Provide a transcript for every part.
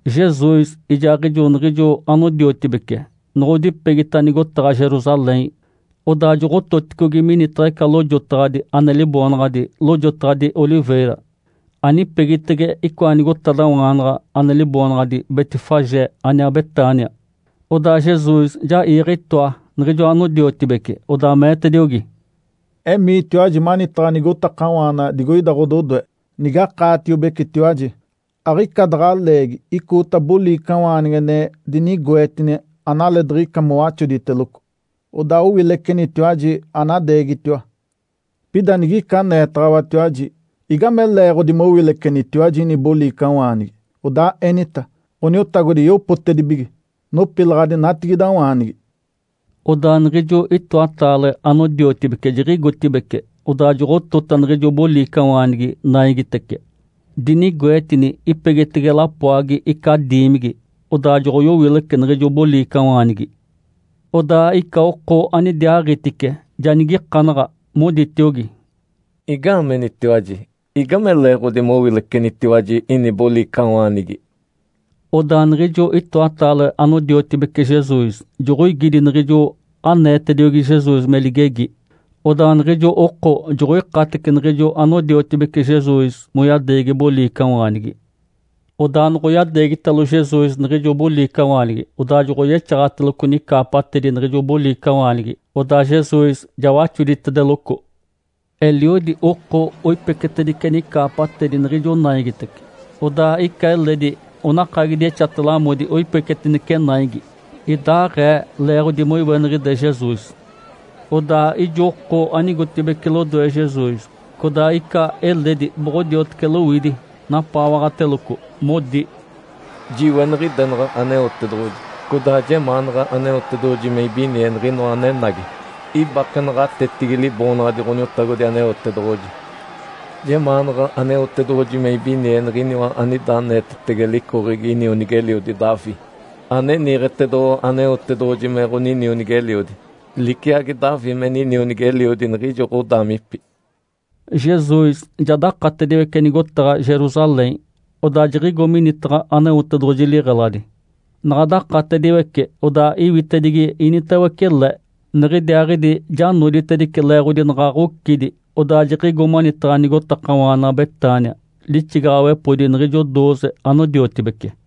Jesus ijaaɡ̶ijo niɡ̶ijo anodiotibece noɡ̶odipegita nigotaɡ̶a Jerusalém, odaa joɡ̶ototicogi minitaɡ̶a ica lojotaɡ̶adi ane liboonaɡ̶adi “Lojotaɡ̶adi Oliveira”, anipegitege icoa nigotadawaanaɡ̶a ane liboonaɡ̶adi Betfagé aniaa Betânia. Odaa Jesus ja iiɡ̶e itoa niɡ̶ijo anodiotibece, odaa meetediogi, “Emiitiwaji manitaɡ̶a nigotakawaana digoida ɡ̶ododoe. Nige akaatiobecetiwaji, aɡ̶ica daɡ̶a leegi icoota boliicawaanigi ane dinigoetini analeediɡ̶ica mowaxoditeloco. Odaa owilecenitiwaji, anadeegitiwa. Pida nigica aneetaɡ̶awatiwaji, ‘Igame leeɡ̶odi mowilecenitiwaji ini boliicawaanigi?’, odaa enita, ‘Ǥoniotagodi yopotedibige. Nopilaɡ̶adi natigidawaanigi.’” Odaa niɡ̶ijo itoatataale anodiotibece jiɡ̶igotibeci, odaa joɡ̶otota niɡ̶ijo boliicawaanigi naigitece, dinigoetini ipegitege lapoagi ica diimigi. Odaa joɡ̶oyowilece niɡ̶ijo boliicawaanigi. Odaa ica oko anidiaaɡ̶itice ja nigikanaɡ̶a, moditiogi, “Igaamenitiwaji? Igame leeɡ̶odi mowilecenitiwaji ini boliicawaanigi?” Odaa niɡ̶ijo itoatataale anodiotibece Jesus joɡ̶oigidi niɡ̶ijo aneetediogi Jesus me ligegi. Odaa niɡ̶ijo oko joɡ̶oikatece niɡ̶ijo anodiotibece Jesus moyadeegi boliicawaanigi. Odaa noɡ̶oyadeegitalo Jesus niɡ̶ijo boliicawaanigi, odaa joɡ̶oyexaɡ̶ateloco nicaapatedi niɡ̶ijo boliicawaanigi, odaa Jesus ja waxoditedeloco. Eliodi oko oipecetedice nicaapatedi niɡ̶ijo naigitece, odaa ica eledi onakagidi exate-lamodi oipecetinece naigi. (Idaɡ̶aee leeɡ̶odi moiweniɡ̶ide Jesus.) Odaa ijo oko anigotibeci lodoe Jesus, codaa ica eledi boɡ̶odiotece lowidi napaawaɡ̶ateloco, modi, “Jiweniɡ̶idenaɡ̶a Aneotedoɡ̶oji! Codaa jemaanaɡ̶a Aneotedoɡ̶oji me ibinie Niɡ̶inoa anenagi ibake naɡ̶atetigi Liboonaɡ̶adi Ǥoniotagodi Aneotedoɡ̶oji! Jemaanaɡ̶a Aneotedoɡ̶oji me ibinie Niɡ̶iniwa anida aneetetege licoɡ̶egi inionigi-eliodi Davi, ane niiɡ̶etedoɡ̶owa Aneotedoɡ̶oji me ɡ̶oninionigi-eliodi, liciagi Davi me ninionigi-eliodi niɡ̶ijo ɡ̶odaamipi!” Jesus ja dakatediwece nigotaɡ̶a Jerusalém, odaa jiɡ̶igo minitaɡ̶a Aneotedoɡ̶oji liɡ̶eladi. Naɡ̶a dakatediwece, odaa iwitedigi initawece le. Niɡ̶idiaaɡ̶idi ja noditedice leeɡ̶odi naɡ̶a ɡ̶ocidi, odaa jiɡ̶igo manitaɡ̶a nigotakawaana Betânia lixigaɡ̶awepodi niɡ̶ijo dooze anodiotibece.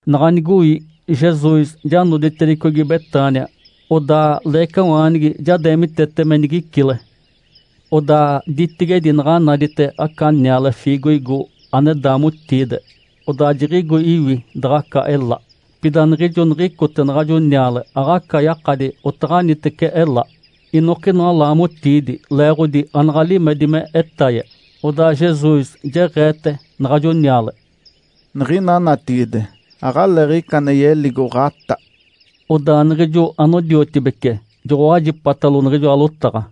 Naɡ̶a nigoi Jesus ja noditedicogi Betânia, odaa leecawaanigi ja deemitete me nigicile. Odaa ditigedi naɡ̶a nadite aca niale fiigoigo ane daamotiide. Odaa jiɡ̶igo iwi daɡ̶aca ela. Pida niɡ̶ijo niɡ̶icote naɡ̶ajo niale, aɡ̶aca yakadi otaɡ̶anitece ela, inokinoa laamotiidi, leeɡ̶odi anaɡ̶a limedi me etaye. Odaa Jesus jeɡ̶eete naɡ̶ajo niale, “Niɡ̶ina natigide, aɡ̶aleeɡ̶ica ane yeligo ɡ̶atá.” Odaa niɡ̶ijo anodiotibece joɡ̶owajipatalo niɡ̶ijoa lotaɡ̶a.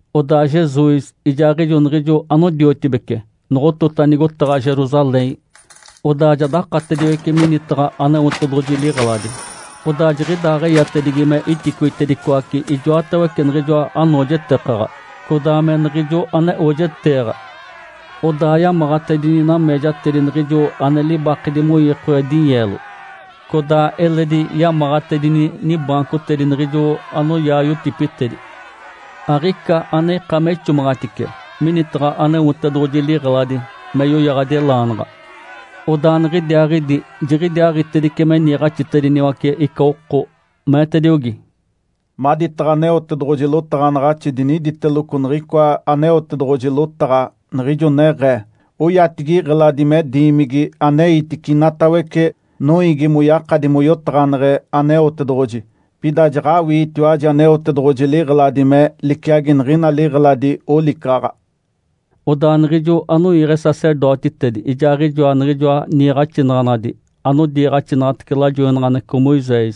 Odaa Jesus ijaaɡ̶ijo niɡ̶ijo anodiotibece noɡ̶otota nigotaɡ̶a Jerusalém, odaa ja dakatediwece minitaɡ̶a Aneotedoɡ̶oji liɡ̶eladi, odaa jiɡ̶idaaɡ̶eyatedigi me iticoitedicoace ijoatawece niɡ̶ijoa anoojetekaɡ̶a codaa me niɡ̶ijo ane oojeteeɡ̶a. Odaa yamaɡ̶atedini nameejatedi niɡ̶ijo ane libakedi moiikoaɡ̶e dinyeelo codaa eledi yamaɡ̶atedini nibaancotedi niɡ̶ijo anoyaa yotipitedi. Aɡ̶ica ane ika me ixomaɡ̶atice minitaɡ̶a Aneotedoɡ̶oji liɡ̶eladi me yoyaɡ̶adi elaanaɡ̶a. Odaa niɡ̶idiaaɡ̶idi jiɡ̶idiaaɡ̶itedice me niiɡ̶axitediniwace ica oko, meetediogi, “Maditaɡ̶a Aneotedoɡ̶oji lotaɡ̶anaɡ̶axi diniditeloco niɡ̶icoa Aneotedoɡ̶oji lotaɡ̶a, niɡ̶ijo neɡ̶ee, ‘Oyatigi iɡ̶eladi me “Diimigi aneitice inatawece noiigi moyakadi moyotaɡ̶aneɡ̶e Aneotedoɡ̶oji”.’ Pida jaɡ̶awiitiwaji Aneotedoɡ̶oji liɡ̶eladi me liciagi niɡ̶ina liɡ̶eladi olicaɡ̶aɡ̶a.” Odaa niɡ̶ijo anoiiɡ̶e sacerdotitedi ijaaɡ̶ijoa niɡ̶ijoa niiɡ̶axinaɡ̶anadi anodiiɡ̶axinaɡ̶atece lajoinaɡ̶aneɡ̶eco Moisés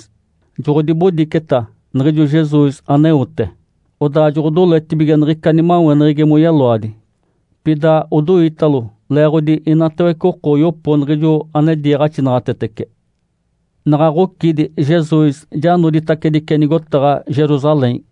joɡ̶odibodiceta niɡ̶ijo Jesus aneote. Odaa joɡ̶odoletibige niɡ̶ica nimaweneɡ̶egi moyeloadi, pida odoitalo leeɡ̶odi inatawece oko oyopo niɡ̶ijo ane diiɡ̶axinaɡ̶atetece. Naɡ̶a ɡ̶ocidi Jesus ja noditacedice nigotaɡ̶a Jerusalém.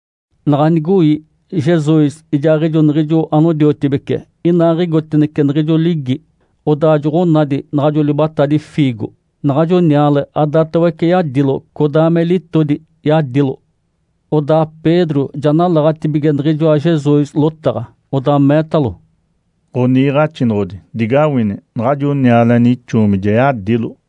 Naɡ̶a nigoi, Jesus ijaaɡ̶ijo niɡ̶ijo anodiotibece inaaɡ̶igotacinece niɡ̶ijo ligi, odaa joɡ̶onadi naɡ̶ajo libatadi fiigo. Naɡ̶ajo niale adatawece yadilo, codaa me litodi yadilo. Odaa Pedro ja nalaɡ̶atibige niɡ̶ijoa Jesus lotaɡ̶a, odaa meetalo, “Ǥoniiɡ̶axinoɡ̶odi, digawini! Naɡ̶ajo niale ane ixoomi ja yadilo.”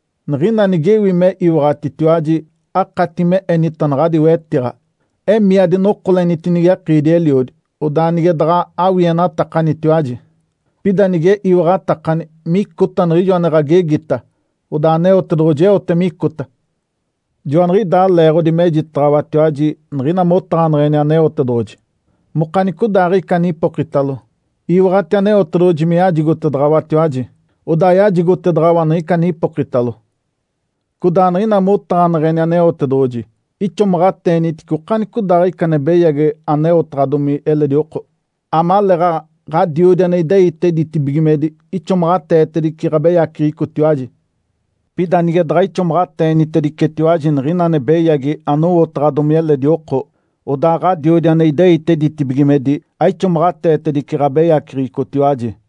Niɡ̶ina nigewi me iwaɡ̶atitiwaji, akati me enita naɡ̶adi wetiɡ̶a, ‘Emii, adinokolenitinigi akiidi-eliodi!’ Odaa nige daɡ̶a awienatakanitiwaji, pida nige iwaɡ̶atakani micota niɡ̶ijo ane ɡ̶agegita, odaa Aneotedoɡ̶oji eote micota. Joaniɡ̶idaa leeɡ̶odi mejitaɡ̶awatiwaji niɡ̶ina motaɡ̶aneɡ̶eni Aneotedoɡ̶oji, mokanicodaaɡ̶ica anipokitalo, iwaɡ̶ati Aneotedoɡ̶oji me yajigotedaɡ̶awatiwaji, odaa yajigotedaɡ̶awa niɡ̶ica ane ipokitalo. Codaa niɡ̶ina motaɡ̶aneɡ̶eni Aneotedoɡ̶oji, ixomaɡ̶ateenitice okanicodaaɡ̶ica ane beyagi aneotaɡ̶adomi eledi oko, amaleeɡ̶aɡ̶a Ǥadiodi ane ideite ditibigimedi ixomaɡ̶ateetedice ɡ̶abeyaceɡ̶ecotiwaji. Pida nige daɡ̶a ixomaɡ̶ateeniticetiwaji niɡ̶ina ane beyagi anowotaɡ̶adomi eledi oko, odaa Ǥadiodi ane ideite ditibigimedi aixomaɡ̶ateetedice ɡ̶abeyaceɡ̶ecotiwaji.”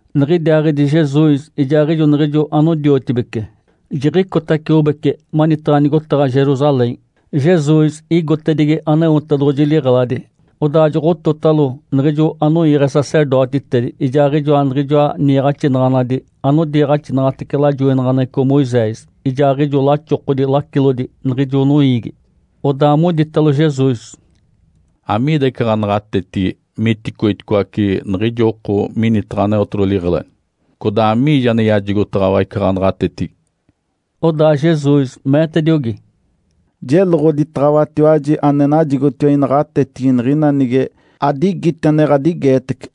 Niɡ̶idiaaɡ̶idi Jesus ijaaɡ̶ijo niɡ̶ijo anodiotibece jiɡ̶icotaciobece manitaɡ̶a nigotaɡ̶a Jerusalém. Jesus igotedigi Aneotedoɡ̶oji liɡ̶eladi, odaa joɡ̶ototalo niɡ̶ijo anoiiɡ̶e sacerdotitedi, ijaaɡ̶ijoa niɡ̶ijoa niiɡ̶axinaɡ̶anadi anodiiɡ̶axinaɡ̶atece lajoinaɡ̶aneɡ̶eco Moisés, ijaaɡ̶ijo laxokodi lacilodi niɡ̶ijo noiigi. Odaa moditalo Jesus, “Amiida ica ɡ̶anaɡ̶atetigi miticoiticoace niɡ̶ijo oko minitaɡ̶a Aneotedoɡ̶oji liɡ̶eladi? Codaa amiijo ane yajigotaɡ̶awa ica ɡ̶anaɡ̶atetigi?” Odaa Jesus meetediogi, “Jeloɡ̶oditaɡ̶awatiwaji ane najigotiwa inaɡ̶atetigi niɡ̶ina nige adigiti ane ɡ̶adigeetece.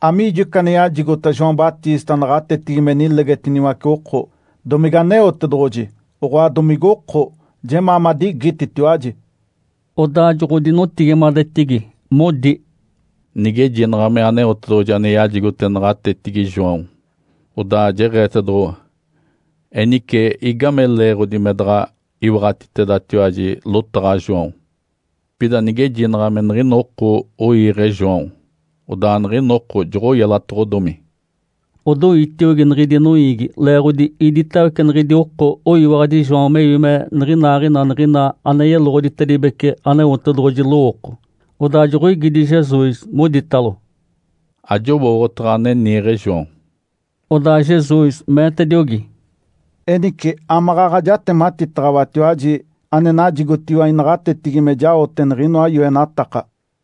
Amiijo ica ane yajigota João Batista naɡ̶atetigi me nilegetiniwace oko? Domige Aneotedoɡ̶oji, oɡ̶oa domigoko? Jemaa madigititiwaji!” Odaa joɡ̶odinotigimadetigi, modi, “Nigejinaɡ̶a me Aneotedoɡ̶oji ane yajigote naɡ̶atetigi João, odaa jeɡ̶eetedoɡ̶owa, ‘Enice igame leeɡ̶odi me daɡ̶a iwaɡ̶atitedatiwaji lotaɡ̶a João?’ Pida nigejinaɡ̶a me niɡ̶ina oko oiiɡ̶e João, odaa niɡ̶ina oko joɡ̶oyelatoɡ̶odomi.” Odoitiogi niɡ̶idi noiigi leeɡ̶odi iditawece niɡ̶idi oko oyiwaɡ̶adi João mewi me niɡ̶inaaɡ̶ina niɡ̶ina ane yeloɡ̶oditedibece Aneotedoɡ̶oji lowooko. Odaa joɡ̶oigidi Jesus, moditalo, “Ajowooɡ̶otaɡ̶a ane niiɡ̶e João!” Odaa Jesus meetediogi, “Enice amaɡ̶aɡ̶a jatematitaɡ̶awatiwaji ane najigotiwa inaɡ̶atetigi me jaote niɡ̶inoa yoenataka.”